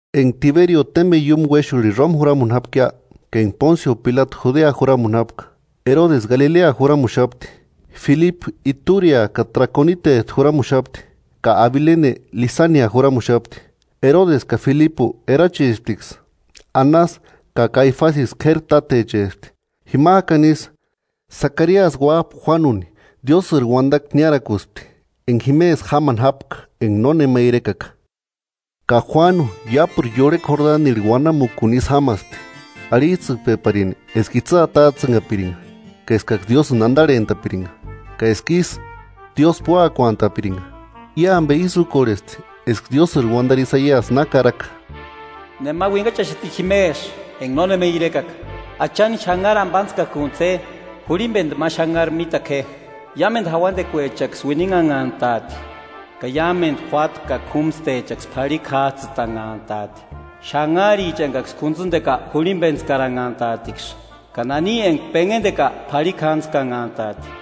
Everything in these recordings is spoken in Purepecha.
Enga Tiberio témbeni iúmu uéxurhini Roma juramuni jápkia, ka enga Pónsio Pilatu Judea juramuni jápka, Erodesi Galilea juramuxapti, Filipu Iturea ka Trakonitejtu juramuxapti, ka Abilene Lisania juramuxapti. Erodesi ka Filipu erachisptiksï. Anasi ka Kaifasiksï k'éri tátechespti. Jimajkani isï, Sakariasï uájpa Juánuni Diósïri uandakua niárakuspti, enga jimesï jámani jápka enga nónema irekaka. Ka Juánu iápuru iurhekua Jordanirhu uanamukuni isï jámaspti, arhijtsïkpeparini eska itsï atajtsïnhapiringa ka eskaksï Diósïni andarhentapiringa, ka eska ísï, Diósï púakuantaapiringa. I ambe ísï úkorhesti eska Diósïri uandari Isaiasi na karaka: “Nema uinhachaxati jimesï enga nónema irekaka: ‘Achani xanhari ambatskakuntsï je; Jurhimbendu ma xanhari mítaku je. Iámendu jauandekuechaksï uininhanhantaati, ka iámendu juáta ka k'úmstechaksï p'arhikua jájtsïtanhantaati, xanharicha engaksï k'untsïndeka jurhimbentskaranhantaatiksï, ka nani enga penhendeka p'arhikjantskanhantaati.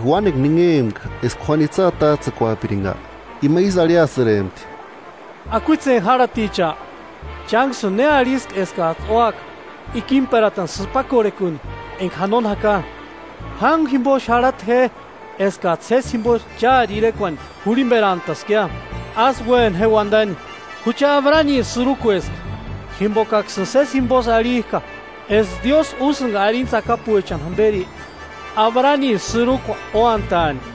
Enga uánekua ninhempka eska Juánu itsï atajtsïkuapiringa, ima ísï arhiasïrempti: “¡Akuitseni járhaticha! ¿Chánksïni ne arhiski eskajtsï úaka ikimperatani sïpakorhekuni enga janoni jaka? Jángua jimbo xarhata je eskajtsï sési jimbo chári irekuani jurhimberantaskia, ásï uéna je uandani: ‘¡Jucha Abraniri sïrukueska!’ Jimbokaksïni sési jimbosï arhijka eska Diósï úsïnga arini tsakapuechani jamberi Abraniri sïrukua úantaani.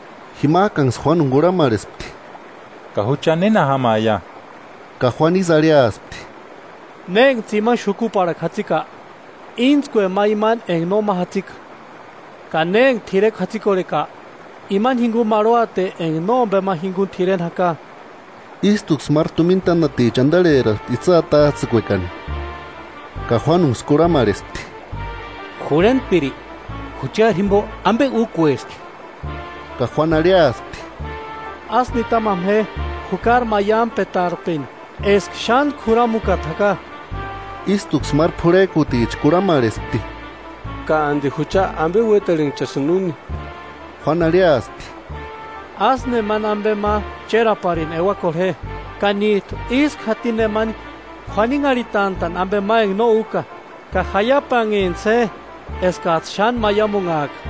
Jimajkanksï Juánuni kurhamarhespti: –¿Ka jucha néna jámaia? Ka Juánu ísï arhiaspti: –Ne enga tsimani xukuparhakua jatsika, íntskue ma imani enga nóma jatsika; ka ne enga t'irekua jatsikorheka, imani jinguni marhuate enga nómbema jinguni t'ireni jaka. Ístuksï máru tumina tánaticha andarheraspti itsï atajtsïkuekani, ka Juánunksï kurhamarhespti: –Jurhentpiri, ¿Juchari jimbo ambe úkueski? Ka Juánu arhiaspti: –Ásï nitamama je jukari maiampetarpeni eska xántku juramukata jaka. Ístuksï máru p'urhejkuticha kurhamarhespti: –¿Ka andi jucha ambe uétarhenchasïnki úni? Juánu arhiaspti: –Ásï nemani ambe ma chéraparini euakorhe je ka níjtu ísku jatini nemani k'uaninharhitantani ambe ma enga no úka; ka jaiapanhentsï je eskajtsï xáni maiamunhajka.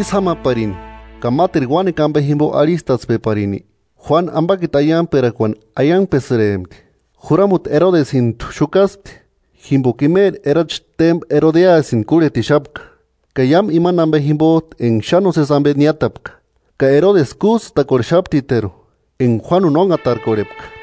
Ísï jámaparini ka máteru uánekua ambe jimbo arhistatspeparini; Juánu ambakiti aiangperakuani aiangpesïrempti. Juramuti Erodesintu xukaspti, jimboka imeri erachi témba Erodiasïni kúrhetixapka, ka iámu imani ambe jimbojtu enga xáni nósesi ambe niátapka; ka Erodesi kújtsïnchakorhesptiteru, enga Juánuni ónhatarkorhepka.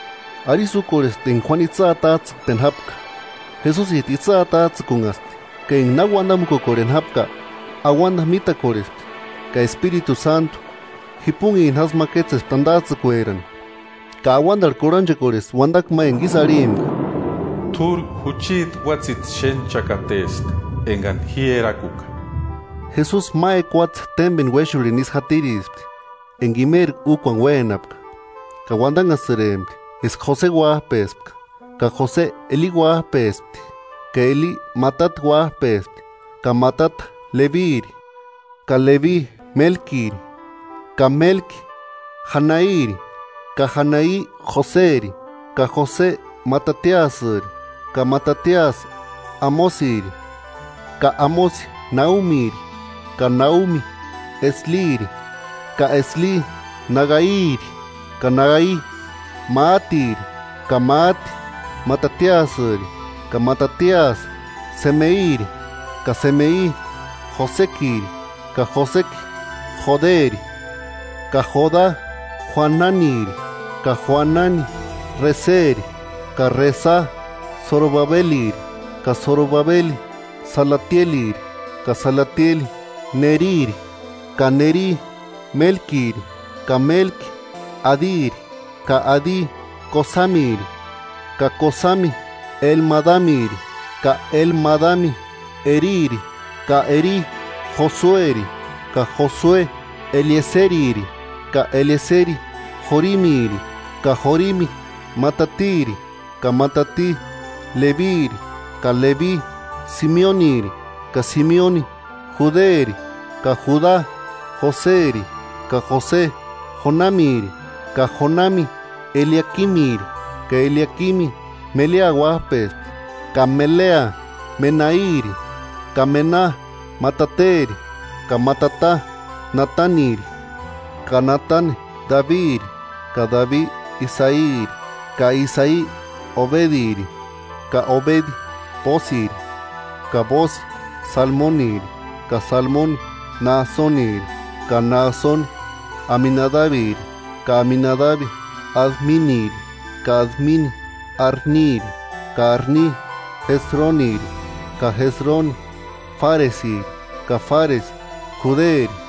Arisï úkorhespti enga Juánu itsï atajtsïkpeni jápka, Jesusijtu itsï atajtsïkunhaspti; ka enga na uandamukukorheni jápka, auanda mítakorhespti ka Espiritu Sántu, jipunhini jásï ma kétsespti andajtsïkuerani, ka auandarhu kurhanchekorhespti uandakua ma enga ísï arhimpka: –T'úri jucheti uátsïti xénhchakateska, engani ji erakuka. Jesusi ma ekuatse témbeni uéxurhini isï jatirispti enga imeri úkuani uénapka. Ka uandanhasïrempti eska Jose uájpespka. Ka Jose Eli uájpespti, ka Eli Matati uájpespti, ka Matati Lebiri, ka Lebi Mélkiri, ka Mélki Janairi, ka Janai Joseri, ka Jose Matatiasïri, ka Matatiasï Amosiri, ka Amosi Naumiri, ka Naumi Esliri, ka Esli Nagairi, ka Nagai Máatiri, ka Máati Matatiasïri, ka Matatiasï Semeiri, ka Semei Josekiri, ka Joseki Joderi, ka Joda Joananiri, ka Joanani Reseri, ka Resa Sorobabeliri, ka Sorobabeli Salatieliri, ka Salatieli Neriri, ka Neri Mélkiri ka Mélki Adiri, ka Adi Kosamiri, ka Kosami Elmadamiri, ka Elmadami Eriri, Ka Eri Josueri, ka Josue Elieseriri, ka Elieseri Jorimiri, ka Jorimi Matatiri, ka Matati Lebiri, ka Lebi Simeoniri, ka Simeoni Juderi, ka Juda Joseri, ka Jose Jonamiri, ka Jonami Eliakimiri, ka Eliakimi Melea uájpespti, ka Melea Menairi, ka Mena Matateri, ka Matata Nataniri, ka Natani Dabiri, ka Dabi Isairi, ka Isai Obediri, ka Obedi Bóosiri, ka Bóosi Salmoniri, ka Salmoni Náasoniri, ka Náasoni Aminadabiri, ka Aminadabi Adminiri, ka Admini Arniri, ka Arni Jesroniri, ka Jesroni Fáresiri, ka Fáresi Juderi,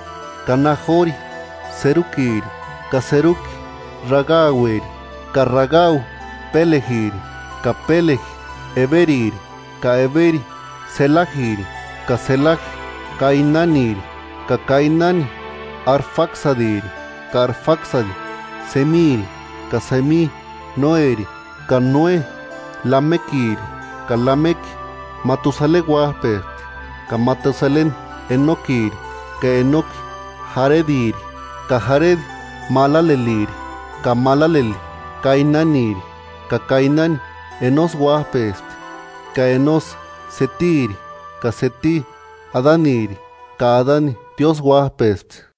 ka Najori Serukiri, ka Seruki Ragaueri, ka Ragau Pélejiri, ka Péleji Eberiri, ka Eberi Selajiri, ka Selaji Kainaniri, ka Kainani Arfaksadiri, ka Arfaksadi Semiri, ka Semi Noéri, ka Noe Lamekiri, ka Lameki Matusaleni uájpespti, ka Matusaleni Enokiri, ka Enoki Jarediri, ka Jaredi Malaleliri, ka Malaleli Kainaniri, ka Kainani Enosi uájpespti, ka Enosi Setiri, ka Seti Adaniri, ka Adani Diósï uájpespti.